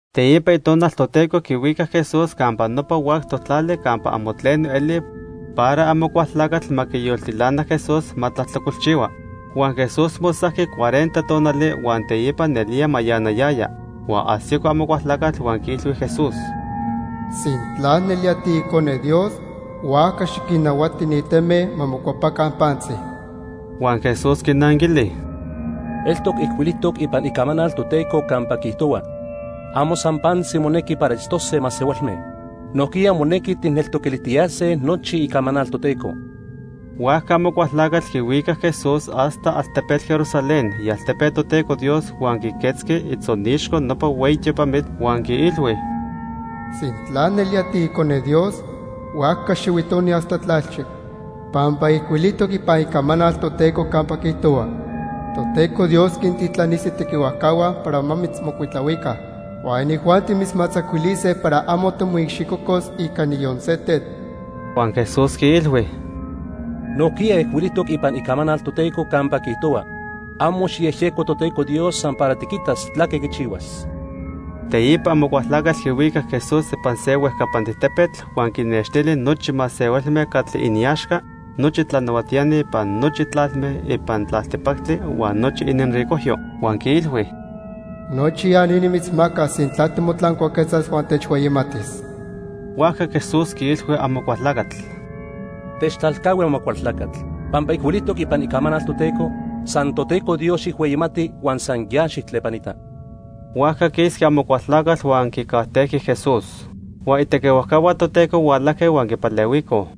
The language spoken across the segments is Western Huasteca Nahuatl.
Teipa Itonal Toteco quihuicac Jesús campa nopa huactoc tlali campa amo tleno eli para Amocualtlacatl ma quiyoltilana Jesús ma tlajtlacolchihua. Huan Jesús mosajqui cuarenta tonali, huan teipa nelía mayanayaya. Huan ajsico Amocualtlacatl huan quiilhui Jesús: —Sintla nelía tiIcone Dios, huajca xiquinnahuati ni teme ma mocuepaca pantzi. Huan Jesús quinanquili: —Eltoc ijcuilijtoc ipan Icamanal Toteco campa quiijtohua: 'Amo san pantzi monequi para itztose masehualme. Nojquiya monequi tijneltoquilijtiyase nochi Icamanal Toteco.' Huajca Amocualtlacatl quihuicac Jesús hasta altepetl Jerusalén, ialtepe Toteco Dios, huan quiquetzqui itzonixco nopa hueyi tiopamitl, huan quiilhui: —Sintla nelía tiIcone Dios, huajca xihuitoni hasta tlalchi pampa ijcuilijtoc ipan Icamanal Toteco campa quiijtohua: 'Toteco Dios quintitlanis itequihuajcahua para ma mitzmocuitlahuica, huan inijuanti mitzmatzacuilise para amo timoicxicocos ica niyon se tetl.' Huan Jesús quiilhui: —Nojquiya ijcuilijtoc ipan Icamanal Toteco campa quiijtohua: 'Amo xijyejyeco Toteco Dios san para tiquitas tlaque quichihuas.' Teipa Amocualtlacatl quihuicac Jesús ipan se huejcapantic tepetl huan quinextili nochi masehualme catli iniaxca nochi tlanahuatiani ipan nochi tlalme ipan tlaltipactli huan nochi ininricojyo. Huan quiilhui: —Nochi ya ni nimitzmacas sintla timotlancuaquetzas huan techhueyimatis. Huajca Jesús quiilhui Amocualtlacatl: —Techtlalcahui Amocualtlacatl. Pampa ijcuilijtoc ipan Icamanal Toteco: 'San Toteco Dios xijhueyimati huan san ya xijtlepanita.' Huajca quisqui Amocualtlacatl huan quicajtejqui Jesús. Huan itequihuajcahua Toteco hualajque huan quipalehuicoj.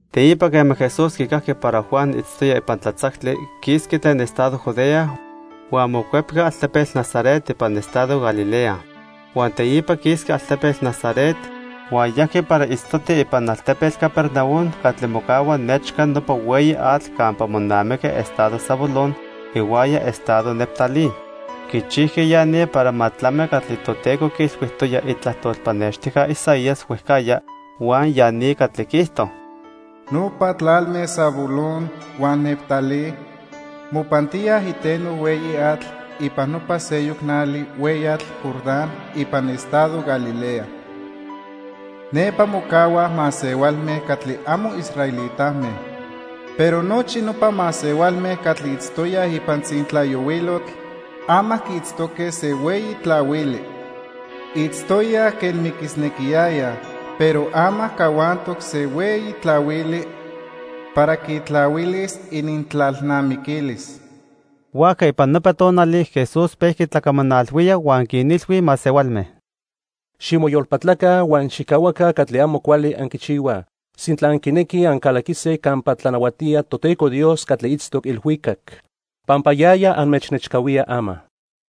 Teipa quema Jesús quicajqui para Juan itztoya ipan tlatzactli, quisqui tlen estado Judea, huan mocuepqui altepetl Nazaret ipan estado Galilea. Huan teipa quisqui altepetl Nazaret huan yajqui para itztoti ipan altepetl Capernaum catli mocahua nechca nopa hueyi atl campa monamiqui estado Zabulón ihuaya estado Neftalí. Quichijqui ya ni para ma tlami catli Toteco quiilhuijtoya itlajtol pannextijca Isaías huejcajya huan ya ni catli quiijto: "Nopa tlalme Zabulón huan Neftalí mopantíaj iteno hueyi atl ipan nopa seyoc nali hueyatl Jordán ipan estado Galilea. Nepa mocahuaj masehualme catli amo israelitame. Pero nochi nopa masehualme catli itztoyaj ipan tzintlayohuilotl, ama quiitztoque se hueyi tlahuili. Itztoyaj quen miquisnequiyayaj, pero ama cahuantoc se hueyi tlahuili para quitlahuilis inintlalnamiquilis." Huajca ipan nopa tonali Jesús pejqui tlacamanalhuía huan quinilhui masehualme: "Ximoyolpatlaca huan xijcahuaca catli amo cuali anquichihuaj sintla anquinequij ancalaquise campa tlanahuatía Toteco Dios catli itztoc ilhuicac, pampa yaya anmechnechcahuía ama."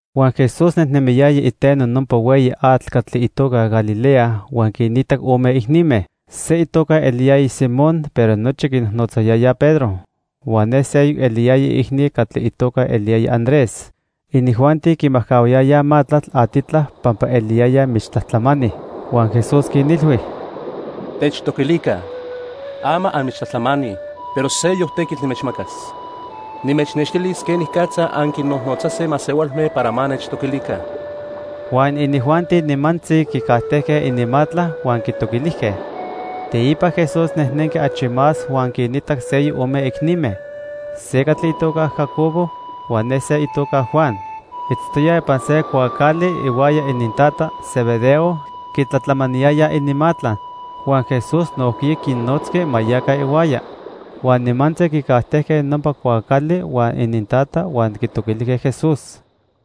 Huan Jesús nejnemiyaya iteno nopa hueyi atl catli itoca Galilea huan quinitac ome icnime. Se itoca eliyaya Simón, pero nochi quinojnotzayayaj Pedro. Huan ne seyoc eliyaya iicni catli itoca eliyaya Andrés. Inijuanti quimajcahuayayaj matlatl atitla pampa eliyayaj michtlajtlamani. Huan Jesús quinilhui: —Techtoquilica. Ama anmichtlajtlamani, pero seyoc tequitl nimechmacas. Nimechnextilis quenicatza anquinnojnotzase masehualme para ma nechtoquilica. Huan inijuanti nimantzi quicajtejque ininmatla huan quitoquilijque. Teipa Jesús nejnenqui achi más huan quinitac seyoc ome icnime, se catli itoca Jacobo huan ne se itoca Juan. Itztoyaj ipan se cuaacali ihuaya inintata, Zebedeo, quitlatlamaniyayaj ininmatla. Huan Jesús nojquiya quinnotzqui ma yaca ihuaya. Huan nimantzi quicajtejque nopa cuaacali huan inintata; huan quitoquilijque Jesús.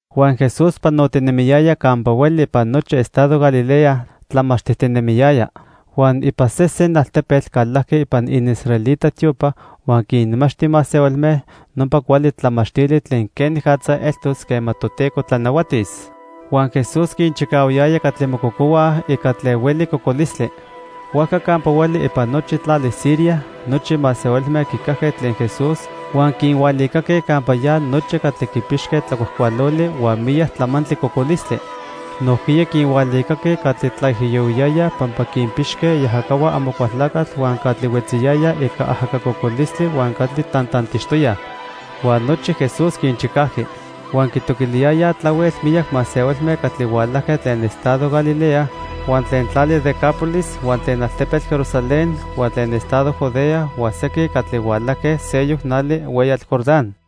Huan Jesús panotinemiyaya campa hueli ipan nochi estado Galilea, tlamachtijtinemiyaya. Huan ipan sesen altepetl calajqui ipan iniisraelita tiopa huan quinmachti masehualme nopa cuali tlamachtili tlen quenicatza eltos quema Toteco tlanahuatis. Huan Jesús quinchicahuayaya catli mococohuaj ica tlen hueli cocolistli. Huajca campa hueli ipan nochi tlali Siria nochi masehualme quicajque tlen Jesús, huan quinhualicaque campa ya nochi catli quipixque tlacuajcualoli huan miyac tlamantli cocolistli. Nojquiya quinhualicaque catli tlaijiyohuiyayaj pampa quinpixque iajacahua Amocualtlacatl, huan catli huetziyayaj ica ajaca cocolistli huan catli tantantixtoyaj. Huan nochi Jesús quinchicajqui. Huan quitoquiliyayaj tlahuel miyac masehualme catli hualajque tlen estado Galilea, huan tlen tlali Decápolis, huan tlen altepetl Jerusalén, huan tlen estado Judea huan sequin catli hualajque seyoc nali hueyatl Jordán.